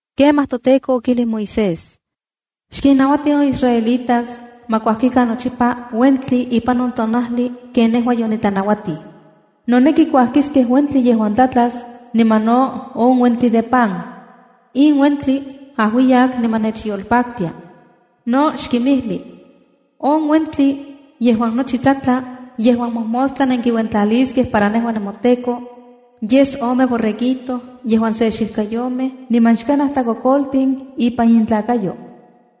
Kemaj toTEKO okijlij Moisés: “Xkinnauati on israelitas ma kuajkikan nochipa uentli ipan on tonajli ken nejua yonitlanauatij. Noneki kuajkiskej uentli yejuan tlatlas niman no on uentli de pan. In uentli ajuiyak niman nechyolpaktia. No xkinmijli: On uentli yejuan nochi tlatla yejuan mojmostla nenkiuentlaliskej para nejua nemoTEKO, yes ome borreguito yejuan se xijkayomej niman xkanaj tlakokoltin ipan intlakayouan.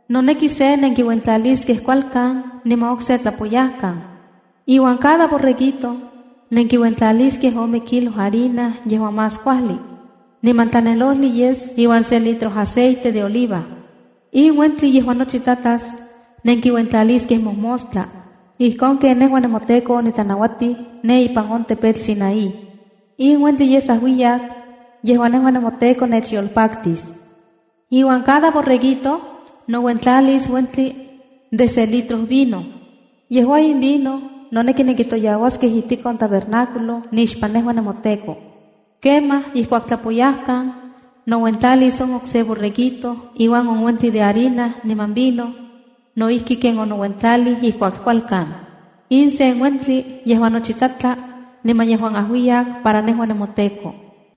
Noneki se nenkiuentlaliskej kualkan, niman okse tlapoyajkan. Iuan cada borreguito nenkiuentlaliskej ome kilo harina yejuan más kuajli, niman tlanelojli yes iuan se litro aceite de oliva. In uentli yejuan nochi tlatlas, nenkiuentlaliskej momostla, ijkon ken nejua nemoTEKO otlanauatij ne ipan on tepetl Sinaí. In uentli yes ajuiyak yejuan kipaktis nejua nemoTEKO. Iuan cada se borreguito nouentlalis uentli de se litro vino. Yejua in vino noneki nenkitotoyauaskej ijtik on tabernáculo nixpan nekau nemoTEKO. Kemaj ijkuak tlapoyajkan, nouentlalis on okse borreguito iuan on uentli de harina niman vino, no ijki ken onouentlalij ijkuak kualkan. In sen uentli yejuan nochi tlatla niman yejuan ajuiyak para nejua nemoTEKO.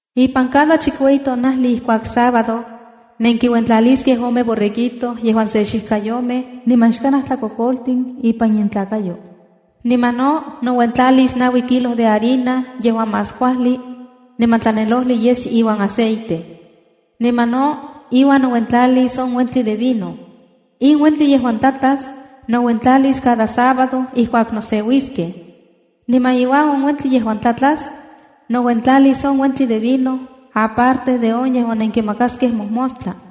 ’Ipan cada chikueyi tonajli ijkuak sábado, nenkiuentlaliskej ome borreguito yejuan se xijkayomej niman xkanaj tlakokoltin ipan intlakayo. Niman no nouentlalis naui kilo de harina yejuan más kuajli, niman tlanelojli yes iuan aceite. Niman no, iuan nouentlalis on uentli de vino. In uentli yejuan tlatlas, nouentlalis cada sábado ijkuak noseuiskej. Niman iuan on uentli yejuan tlatlas, nouentlalis on uentli de vino aparte de on yejuan nenkimakaskej mojmostla.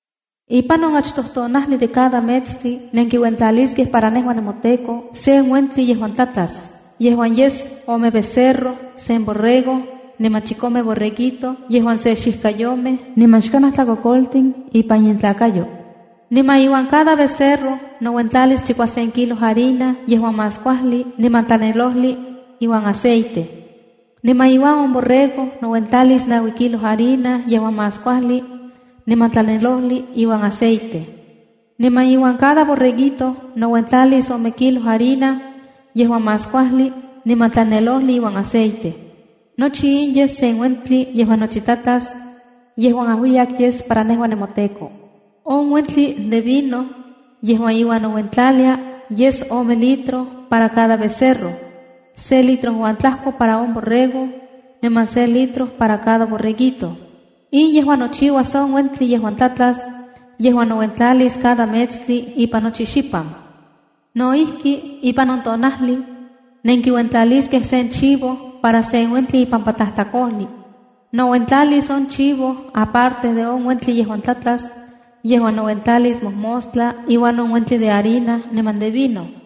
’Ipan on achtoj tonajli de cada metstli nenkiuentlaliskej para nejua nemoTEKO sen uentli yejuan tlatlas, yejuan yes ome becerro, sen borrego, niman chikome borreguito yejuan se xijkayomej niman xkanaj tlakokoltin ipan intlakayo. Niman iuan cada becerro nouentlalis chikuasen kilo harina yejuan más kuajli niman tlanelojli iuan aceite. Niman iuan on borrego nouentlalis naui kilo harina yejuan más kuajli, niman tlanelojli iuan aceite. Niman iuan cada borreguito nouentlalis ome kilo harina yejuan más kuajli niman tlanelojli iuan aceite. Nochi in yes sen uentli yejuan nochi tlatlas, yejuan ajuiyak yes para nejua nemoTEKO. On uentli de vino yejuan iuan nouentlalia, yes ome litro para cada becerro, se litro uan tlajko para on borrego, niman se litro para cada borreguito. In yejua nochiuas on uentli yejuan tlatlas, yejuan nouentlalis cada metstli ipan nochi xipan. No ijki, ipan on tonajli, nenkiuentlaliskej sen chivo para sen uentli ipampa tlajtlakojli. Nouentlalis on chivo aparte de on uentli yejuan tlatlas yejuan nouentlalis mojmostla iuan on uentli de harina niman de vino.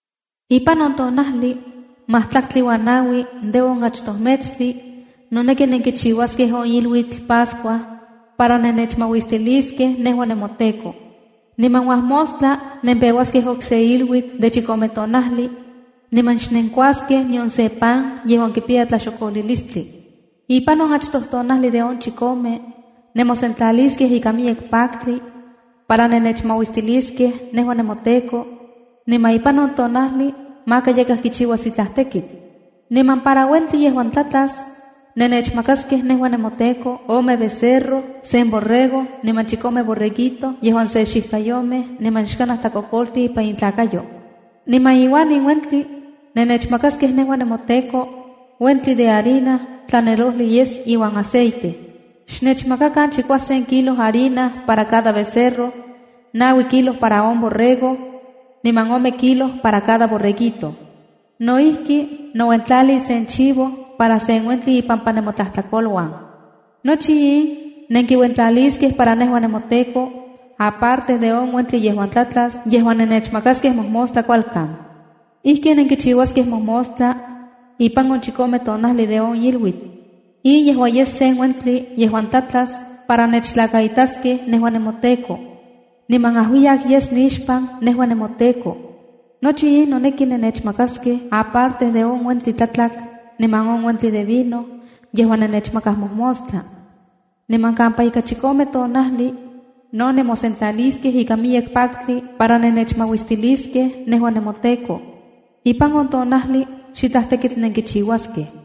’Ipan on tonajli majtlaktli uan naui de on achtoj metstli, noneki nenkichiuaskej on iluitl Pascua para nennechmauistiliskej, nejua nemoTEKO. Niman uajmostla, nempeuaskej okse iluitl de chikome tonajli, niman xnenkuaskej nion se pan yejuan kipiya tlaxokolilistli. Ipan on achtoj tonajli de on chikome, nemosentlaliskej ikan miyek paktli para nennechmauistiliskej nejua nemoTEKO. Niman ipan on tonajli maka yakaj kichiuas itlaj tekitl. Niman para uentli yejuan tlatlas, nennechmakaskej nejua nemoTEKO, ome becerro, sen borrego, niman chikome borreguito yejuan se xijkayomej niman xkanaj tlakokoltin ipan intlakayo. Niman iuan in uentli nennechmakaskej nemoTEKO, uentli de harina tlanelojli yes iuan aceite. Xmakakan chikuasen kilo harina para cada becerro, naui kilo para on borrego, niman ome kilo para cada borreguito. No ijki, nouentlalis sen chivo para sen uentli ipampa nemotlajtlakoluan. Nochi in nenkiuentlaliliskej nejua nemoTEKO aparte de on uentli yejuan tlatlas yejuan nennechmakaskej mojmostla kualkan. Ijkin nenkichiuaskej mojmostla ipan on chikome tonajli de on iluitl. In yejua yes uentli yejuan tlatlas para nennechtlakaitaskej nejua nemoTEKO niman ajuiyak yes nixpan, yejua toTEKO. Nochi in noneki nennechmakaskej aparte de on uentli tlatlak niman on uentli de vino yejuan nenkimakaj mojmostla. Niman kampa ika chikome tonajli, no nemosentlaliskej ikan miyek paktli para nennechmauistiliskej nejua nemoTEKO. Ipan on tonajli xitlaj tekitl nenkichiuaskej.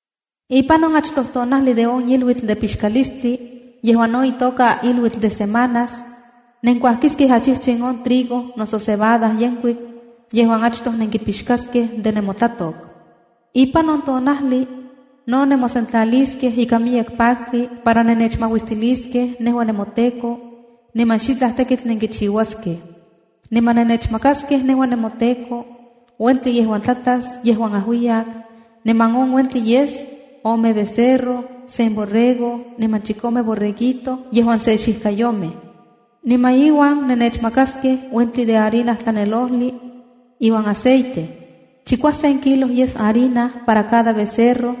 ’Ipan on achtoj tonajli de on iluitl de Pixkalistli yejuan no itoka iluitl de Semanas, nenkuajkiskej achijtsin on trigo noso cebada yenkuik yejuan achtoj nenkipixkaskej de nemotlatok. Ipan on tonajli no nemosentlaliskej ikan miyek paktli para nennechmauistiliskej nejua nemoTEKO, niman xitlaj tekitl nenkichiuaskej. Niman nennechmakaskej nejua nemoTEKO, uentli yejuan tlatlas yejuan ajuiyak, niman on uentli yes: ome becerro, sen borrego, niman chikome borreguito yejuan se xijkayomej. Niman iuan nennechmakaskej uentli de harina tlanelojli iuan aceite. Chikuasen kilo yes harina para cada becerro,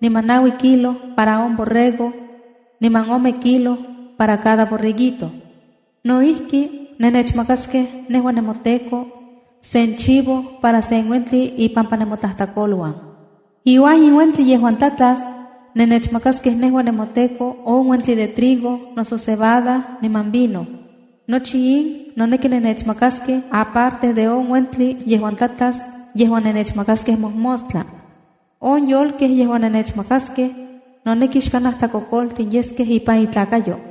niman naui kilo para on borrego, niman ome kilo para cada borreguito. No ijki, nennechmakaskej nejua nemoTEKO sen chivo para sen uentli ipampa nemotlajtlakoluan. Iuan in uentli yejuan tlatlas, nennechmakaskej nejua nemoTEKO on uentli de trigo noso cebada niman vino. Nochi in noneki nennechmakaskej, aparte de on uentli yejuan tlatlas yejuan nennechmakaskej mojmostla. On yolkej yejuan nennechmakaskej, noneki xkanaj tlakokoltin yeskej ipan intlalnakayo.